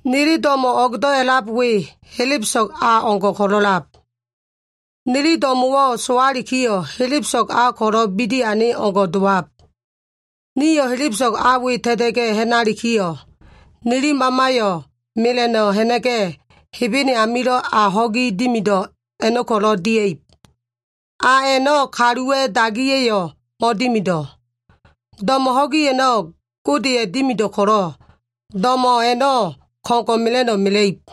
Nili do꞉mo꞉ o꞉gdo꞉ a꞉lab we, helebeso꞉g a o꞉ngo꞉ ko꞉lo꞉lab. Nili do꞉mo꞉wo꞉ sowalikiyo꞉, helebeso꞉g a ko꞉lo꞉ bidi ane o꞉ngo꞉ dowab. Nio꞉ helebeso꞉g a we ta꞉ta꞉ga꞉ ha꞉nalikiyo꞉, nili mamayo꞉ mela꞉no꞉ ha꞉na꞉ga꞉, Hebene hen amilo꞉ a ho꞉gi dimido꞉ a꞉no꞉ ko꞉lo꞉ dia꞉ib. A a꞉no꞉ kaluwa꞉ dagiya꞉yo꞉ mo꞉dimido꞉. Do꞉mo꞉ ho꞉gi a꞉no꞉ Godeya꞉ dimido꞉ ko꞉lo꞉, do꞉mo꞉ a꞉no꞉ ko꞉ngo꞉ mela꞉no꞉ mela꞉ib.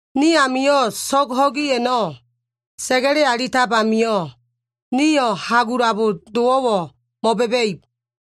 Ni amio꞉ so꞉g ho꞉gi a꞉no꞉ sa꞉ga꞉le alitab amio꞉, nio꞉ hagulabo dowo꞉wo꞉ mo꞉ba꞉ba꞉ib.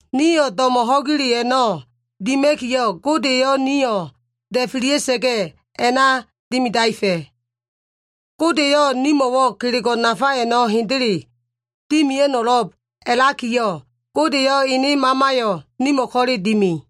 Nio꞉ do꞉mo꞉ ho꞉gile a꞉no꞉ dima꞉kiyo꞉, Gode eyo꞉ nio꞉ da꞉felia꞉sa꞉ga꞉ a꞉na dimidaefa꞉. Gode eyo꞉ nimo꞉wo꞉ kelego꞉ nafa a꞉no꞉ hendele dimia꞉no꞉lo꞉b a꞉lakiyo꞉, Gode eyo꞉ ene Mamayo꞉ nimo꞉ ko꞉le dimi.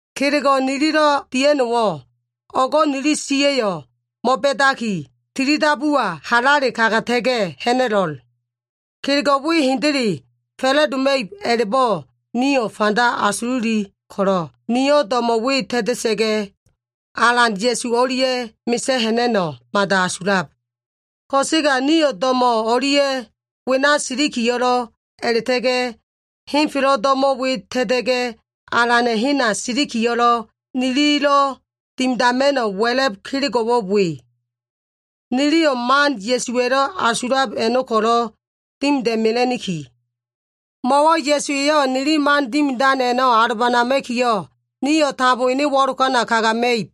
Kelego꞉ nililo꞉ dia꞉no꞉wo꞉, o꞉go꞉ nili siya꞉yo꞉ mo꞉ba꞉daki, tilidabuwa halale kagata꞉ga꞉ ha꞉na꞉lo꞉l. Kelego꞉ we hendele fa꞉la꞉doma꞉ib a꞉la꞉bo꞉ nio꞉ fanda asululi ko꞉lo꞉, nio꞉ do꞉mo꞉ we ta꞉ta꞉sa꞉ga꞉, Alan Ya꞉su o꞉lia꞉ mesa꞉ ha꞉na꞉no꞉ mada asulab. Ko꞉sega nio꞉ do꞉mo꞉ o꞉lia꞉ wena o꞉silikiyo꞉lo꞉, a꞉la꞉ta꞉ga꞉ henfelo꞉ do꞉mo꞉ we ta꞉ta꞉ga꞉ Alana꞉ hena silikiyo꞉lo꞉, nililo꞉ dimidama꞉no꞉ wa꞉la꞉b kelego꞉wo꞉ we. Niliyo꞉ man Ya꞉suwa꞉lo꞉ asulab a꞉no꞉ ko꞉lo꞉ dimida꞉mela꞉niki. Mo꞉wo꞉ Ya꞉su eyo꞉ nili man dimidan a꞉no꞉ alobanama꞉kiyo꞉, nio꞉ tambo ene wo꞉lokana kagama꞉ib.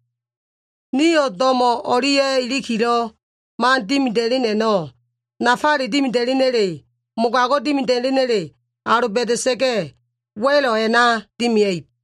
Nio꞉ do꞉mo꞉ o꞉lia꞉ ilikilo꞉ man dimida꞉len a꞉no꞉, nafale dimida꞉lena꞉le, mogago꞉ dimida꞉lena꞉le, aloba꞉da꞉sa꞉ga꞉, wa꞉lo꞉ a꞉na dimia꞉ib.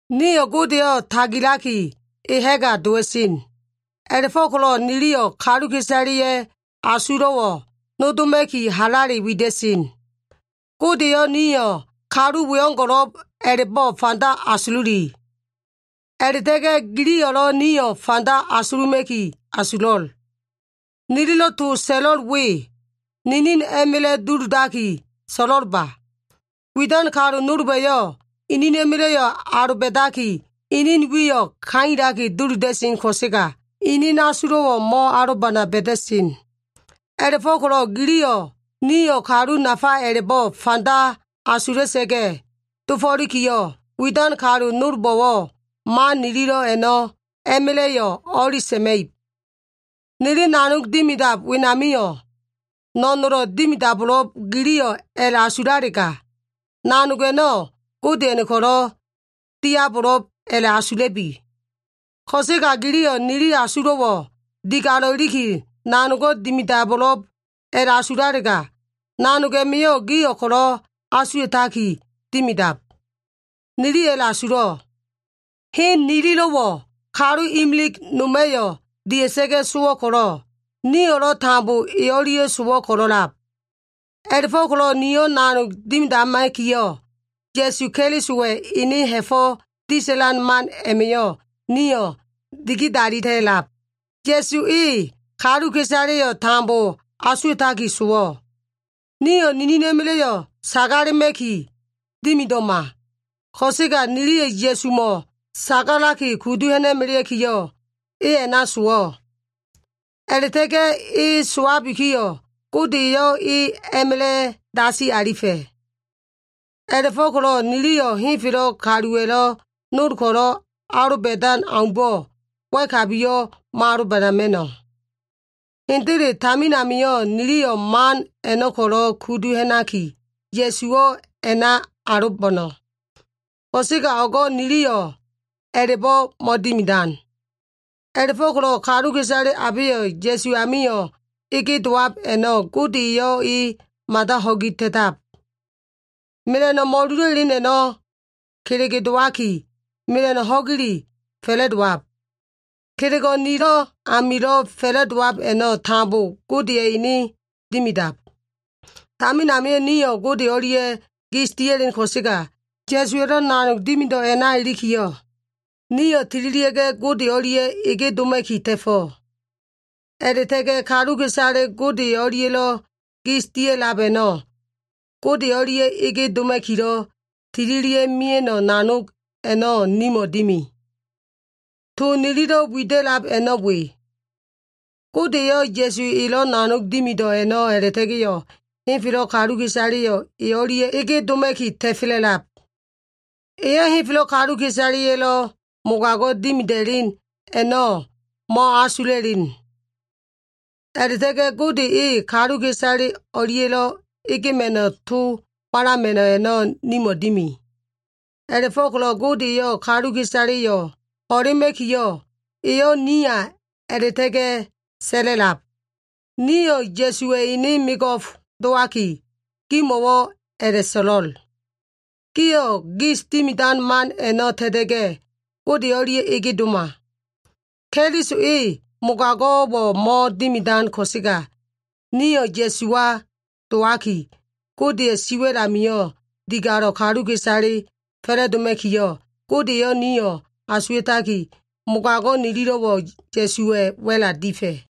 Nio꞉ Godeyo꞉ tagilaki, e ha꞉ga dowa꞉sen. A꞉la꞉fo꞉ko꞉lo꞉ niliyo꞉ kaluka꞉isaleya꞉ asulo꞉wo꞉ nodoma꞉ki halale wida꞉sen. Gode eyo꞉ nio꞉ kalu weo꞉ngo꞉lo꞉b a꞉la꞉bo꞉ fanda asululi. A꞉la꞉ta꞉ga꞉ giliyo꞉lo꞉ nio꞉ fanda asuluma꞉ki asulo꞉l. Nililo꞉ to so꞉lo꞉l we, ninin a꞉ma꞉la꞉ duludaki so꞉lo꞉lba. Widan kalu nolba꞉yo꞉, inina꞉ma꞉la꞉yo꞉ aloba꞉daki, inin wiyo꞉ kailaki duluda꞉sen ko꞉sega, inin asulo꞉wo꞉ mo꞉alobana ba꞉da꞉sen. A꞉la꞉fo꞉ko꞉lo꞉ giliyo꞉ nio꞉ kalu nafa a꞉la꞉bo꞉ fanda asula꞉sa꞉ga꞉ dofo꞉likiyo꞉, widan kalu nolbo꞉wo꞉ man nililo꞉ a꞉no꞉ a꞉ma꞉la꞉yo꞉ o꞉li sa꞉ma꞉ib. Nili nanog dimidab wenamio꞉, no꞉nolo꞉ dimidabo꞉lo꞉b giliyo꞉ a꞉la꞉asulalega, nanog a꞉no꞉ Godeya꞉no꞉ ko꞉lo꞉ diabo꞉lo꞉b a꞉la꞉asula꞉bi. Ko꞉sega giliyo꞉ nili asulo꞉wo꞉ digalo꞉ iliki, nanogo꞉ dimidabo꞉lo꞉b a꞉la꞉bo꞉ asulalega, nanog a꞉ma꞉yo꞉ gio꞉ ko꞉lo꞉ asuwa꞉taki dimidab. Niliyo꞉ a꞉la꞉asulo꞉. Hen nililo꞉wo꞉ kalu imilig noma꞉yo꞉ dia꞉sa꞉ga꞉ sowo꞉ ko꞉lo꞉, nio꞉lo꞉ tambo e o꞉lia꞉ sowo꞉ ko꞉lo꞉lab. A꞉la꞉fo꞉ko꞉lo꞉ nio꞉ nanog dimidama꞉kiyo꞉, Ya꞉su Kelisowa꞉ ene ha꞉fo꞉ disa꞉lan man a꞉ma꞉yo꞉ nio꞉ digidalita꞉lab. Ya꞉su e kaluka꞉isaleyo꞉ tambo asuwa꞉taki sowo꞉. Nio꞉ ninina꞉ma꞉la꞉yo꞉ sagalema꞉ki dimido꞉ma. Ko꞉sega niliyo꞉ Ya꞉sumo꞉ sagalaki kudu ha꞉na꞉melea꞉kiyo꞉, e a꞉na sowo꞉. A꞉la꞉ta꞉ga꞉ e sowabikiyo꞉, Gode eyo꞉ e a꞉ma꞉la꞉ dasi alifa꞉. A꞉la꞉fo꞉ko꞉lo꞉ niliyo꞉ henfelo꞉ kaluwa꞉lo꞉ nol ko꞉lo꞉ aloba꞉dan aumbo꞉ wa꞉kabiyo꞉ mo꞉aloba꞉ma꞉no꞉. Hendele tamin amio꞉ niliyo꞉ man a꞉no꞉ ko꞉lo꞉ kudu ha꞉naki, Ya꞉suwo꞉ a꞉na alobo꞉no꞉. Ko꞉sega o꞉go꞉ niliyo꞉ a꞉la꞉bo꞉ mo꞉dimidan. A꞉la꞉fo꞉ko꞉lo꞉ kaluka꞉isale abeyo꞉ Ya꞉su amilo꞉ ege dowab a꞉no꞉ Gode eyo꞉ e mada ho꞉gi ta꞉tab. Mela꞉no꞉ mo꞉lulo꞉ elen a꞉no꞉ kelege dowaki, mela꞉no꞉ ho꞉gile fa꞉la꞉dowab. Kelego꞉ nilo꞉ amilo꞉ fa꞉la꞉dowab a꞉no꞉ tambo Godeya꞉ ene dimidab. Tamin amio꞉ nio꞉ Gode o꞉lia꞉ gis dia꞉len ko꞉sega, Ya꞉suwa꞉lo꞉ nanog dimido꞉ a꞉na ilikiyo꞉, nio꞉ tililia꞉ga꞉ Gode o꞉lia꞉ ege doma꞉ki ta꞉fo꞉. A꞉la꞉ta꞉ga꞉ kaluka꞉isale Gode o꞉lia꞉lo꞉ gis dia꞉lab a꞉no꞉, Gode o꞉lia꞉ ege doma꞉kilo꞉ tililia꞉ mia꞉no꞉ nanog a꞉no꞉ nimo꞉ dimi. To nililo꞉ wida꞉lab a꞉no꞉ we. Gode eyo꞉ Ya꞉su elo꞉ nanog dimido꞉ a꞉na a꞉la꞉ta꞉ga꞉yo꞉ henfelo꞉ kaluka꞉isaleyo꞉ e o꞉lia꞉ ege doma꞉ki ta꞉fela꞉lab. Eyo꞉ henfelo꞉ kaluka꞉isaleya꞉lo꞉ mogago꞉ dimida꞉len a꞉no꞉ mo꞉asula꞉len. A꞉la꞉ta꞉ga꞉ Gode eyo꞉ kaluka꞉isale o꞉lia꞉lo꞉ egema꞉no꞉ to walama꞉no꞉ a꞉no꞉ nimo꞉ dimi. A꞉la꞉fo꞉ko꞉lo꞉ Gode eyo꞉ kaluka꞉isaleyo꞉ ho꞉lema꞉kiyo꞉, eyo꞉ niya a꞉la꞉ta꞉ga꞉ sa꞉la꞉lab. Niliyo꞉ Ya꞉suwa꞉ ene mego꞉f dowaki, gimo꞉wo꞉ a꞉la꞉so꞉lo꞉l, “Gio꞉ gis dimidan man a꞉no꞉ ta꞉ta꞉ga꞉, Gode o꞉lia꞉ ege doma.” Keliso e mogago꞉wo꞉ mo꞉dimidan ko꞉sega, nio꞉ Ya꞉suwa dowaki, Godeya꞉ siwa꞉l amio꞉ digalo꞉ kaluka꞉isale fa꞉la꞉doma꞉kiyo꞉, Gode eyo꞉ nio꞉ asuwa꞉taki, mogago꞉ nililo꞉wo꞉ Ya꞉suwa꞉ wa꞉la difa꞉.